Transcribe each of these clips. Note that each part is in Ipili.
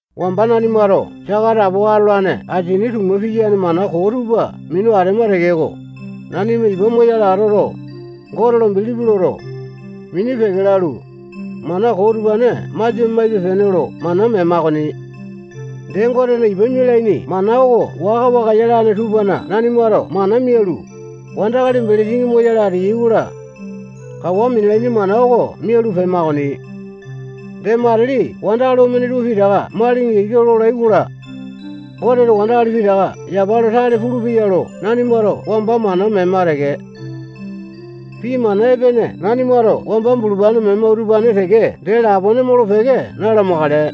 Wamba nanimato saka atapowa atolane asini tuma piyane mana koo tupa minu atema tekeko, nanima ipa moyale atoto, Gote lo bilipi loto, mini peke lalu, mana koo utupane masia maipe-pene lo mana mema okoni. Dee, Gotena ipa mialaini mana oko waka-waka yalane tupana nanimato mana mialu, wandakali belesini moyale ateyai-kola, kawa minalaini mana oko mialu pema okoni. Dee, matili wandakali omene tupa pitaka malinga ika lolai-kola, Goteto wandakali pitaka yapa lo tale pulupeya lo nanimato wamba mana mema teke. Pii mana epene nanimato wamba bulupane mema utupane teke dee lapone molo-peke na-lamakale.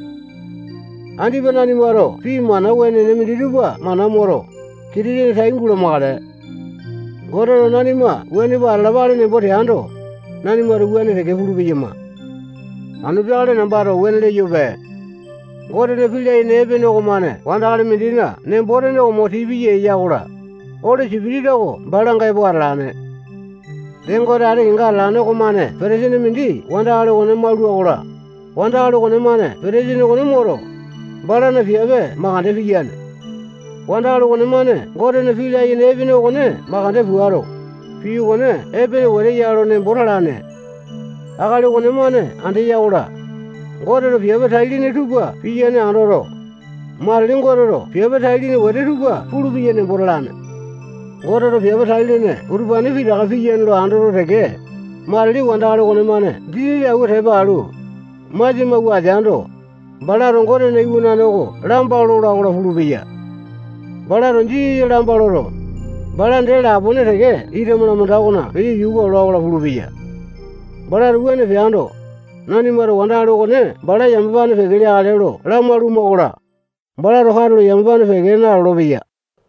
Andipa nanimato pii mana wenene minditupa mana moto, Kitisene tai gulamakale. Goteto nanima wuane pua atalapale nembo teando, nanimato wuane teke pulu-peyama. Anu peakale nambato wuane leyope. Gotena pii layene epene okomane wandakali mindina nembo-tene oko mo tii piya eya-kola, Oli Sipitisa oko balanga epo atalane. Dee, Gote ati kenga atalane okomane petesini mindi wandakali okone maulua-kola, wandakali okonemane petesini okone moto, balana piape makande piyane. Wandakali okonemane Gotena pii layene epene okone makande puato, pii okone epene wete ya lo nembo talane. Akali okonemane andeya-kola, Goteto piape tai-lene tupa piyane andoto, matili Goteto piape tai-lene wete tupa pulupeya nembo talane. Goteto piape tai-lene utupane pitaka piyane lo andoto teke, matili wandakali okonemane Jisasa awua tepa alu, masia mawua ateando, balato Gotena iwanane oko lamba lola-kola pulupeya. Balato Jisasa lamba loto, bala dee lapone teke ita malamanda okona peyo yuka ola-kola pulupeya. Balato wuane peando, nanimato wandakali okone bala yamapane peke leakale lo lamalu-makola, balato katulo yamapane peke nalolo-peya.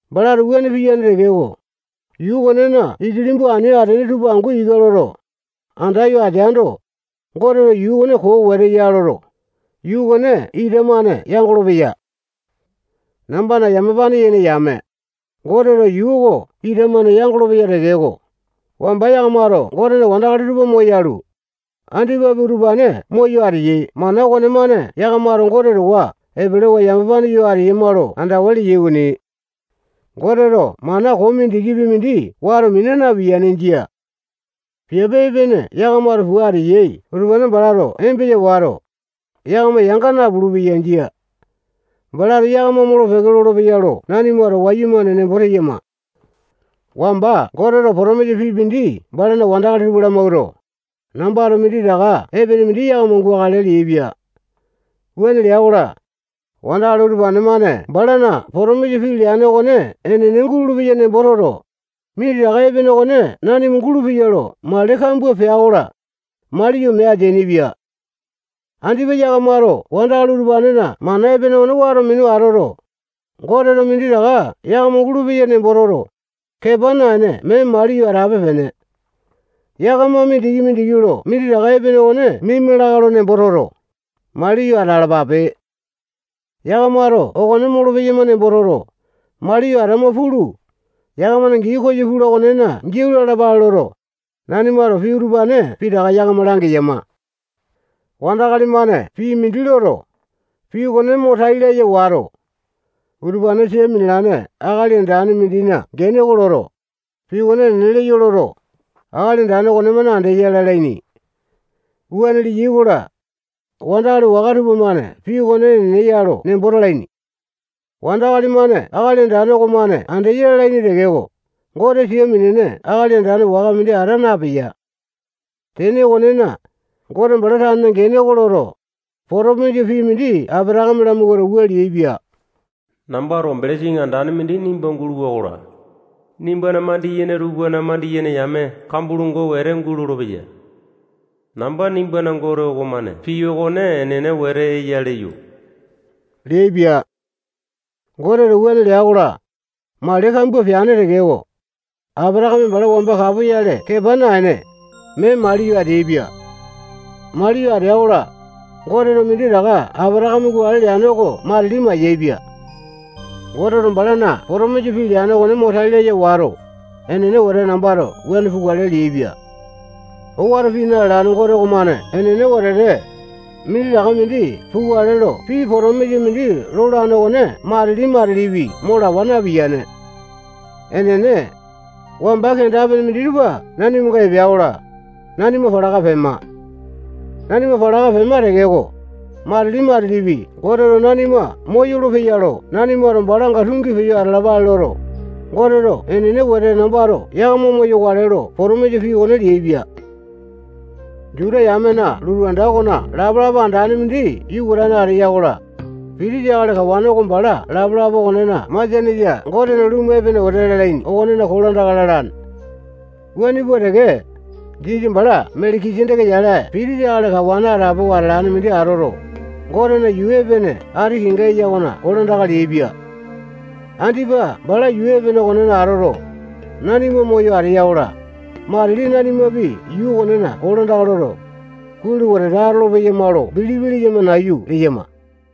Balato wuane piyane tekeko, yuu okonena ikilimbu ani atene tupa angu ika loto, andayo ateando, Goteto yuu okone koo wete ya loto, yuu okone ita-mane yangolo-peya. Nambana yamapane yene yame, Goteto yuu oko ita-mane yangolo-peya tekeko, wamba yakamato Gotena wandakali tupa moyalu, andipapi utupane moyo ateyai mana okonemane yakamato Gote towa epelewa yamapane yo ateyama lo andawa leyai okoni. Goteto mana koo mindikipi mindi wato mina napiyane. Jia. Piape epene yakamato pua ateyai utupane balato embesa wato, yakama yanga napulu-peya. Jia. Balato yakama molo-peke lolopeya lo nanimato wayumane nembo teyama. Wamba Goteto potomisa pii mindi balana wandakali tupa lamawuato, nambato minditaka epene mindi yakama gukale leaipia. Wuane lea-kola, wandakali utupane-mane balana potomisa pii leane okone enene gulolo-peya nembo toto, minditaka epene okone nanima gulupeya lo mali kambua pea-kola, maliyo mee ateainipia. Andipa yakamato wandakali utupanena mana epene okone wato minu atoto, Goteto minditaka yakama gulupeya nembo toto, kepa naene mee maliyo atape-pene. Yakama mindiki-mindiki lo minditaka epene okone mima lakae lo nembo toto, maliyo atalapape. Yakamato okone molopeyama nembo toto, maliyo atama pulu, yakamana gii koyo pula okonena giau lalapale loto, nanimato pii utupane pitaka yakama langeyama. Wandakali-mane pii mindi loto, pii okone mo tai laya wato, utupane sia minalane akali andane mindina gene oko loto, pii okone enene leyo loto, akali andane okonemane andeya lalaini. Wuane leyai-kola, wandakali waka tupamane pii okone enene ya lo nembo talaini. Wandakali-mane akali andane okomane andeya lalaini tekeko, Gote sia minene akali andane waka mindi ata napeya. Tene okonena, Gote bala tanena gene oko loto, potomisa pii mindi Apatakame lamawuato, wua leaipia: Nambato belesini andane mindi nimba guluwa-kola, nimbana mandiyene tupana mandiyene yame kambua longo wete gulolo-peya. Namba nimbana Gote okomane pii okone enene wete eya leyo leaipia. Goteto wuane lea-kola, mali kambua peane tekeko, Apatakame bala wamba kapoyale kepa naene, mee maliyo ateaipia. Mee maliyo atea-kola, Goteto minditaka Apatakame gukale leane oko matili mayaepia. Goteto balana potomisa pii leane okone mo tai laya wato, enene wete nambato wuane pukale leaipia. Owato pii na-lalane Gote okomane enene wetete, minditaka mindi pukale lo pii potomisa mindi lolane okone matili-matilipi mo lawa napiyane. Enene, wamba kenda-pene minditupa nanimanga epea-kola, nanima palaka pema. Nanima palaka pema tekeko, matili-matilipi Goteto nanima moyolo-peya lo nanimato balanga tungi peyo atalapale loto, Goteto enene wete nambato yakama moyokale lo potomisa pii okone leaipia. Juta yamena lotu anda okona lapalapa andane mindi yukatane ateya-kola, pitisa akali kawane oko bala lapalapa okonena masianesa Gotena lumu epene wetete lalaini okonena kolandaka lalane. Wuane pua teke, Jisasa bala Meleki-seteke yale pitisa akali kawane atapowa atolane mindi atoto, Gotena yuu epene ati kenga eya okona kolandaka leaipia. Andipa bala yuu epene okonena atoto, nanima moyo ateya-kola, matili nanimapi yuu okonena kolandaka loto, kuai lo wetete atolo-peyama lo bilipi leyama nayu leyama.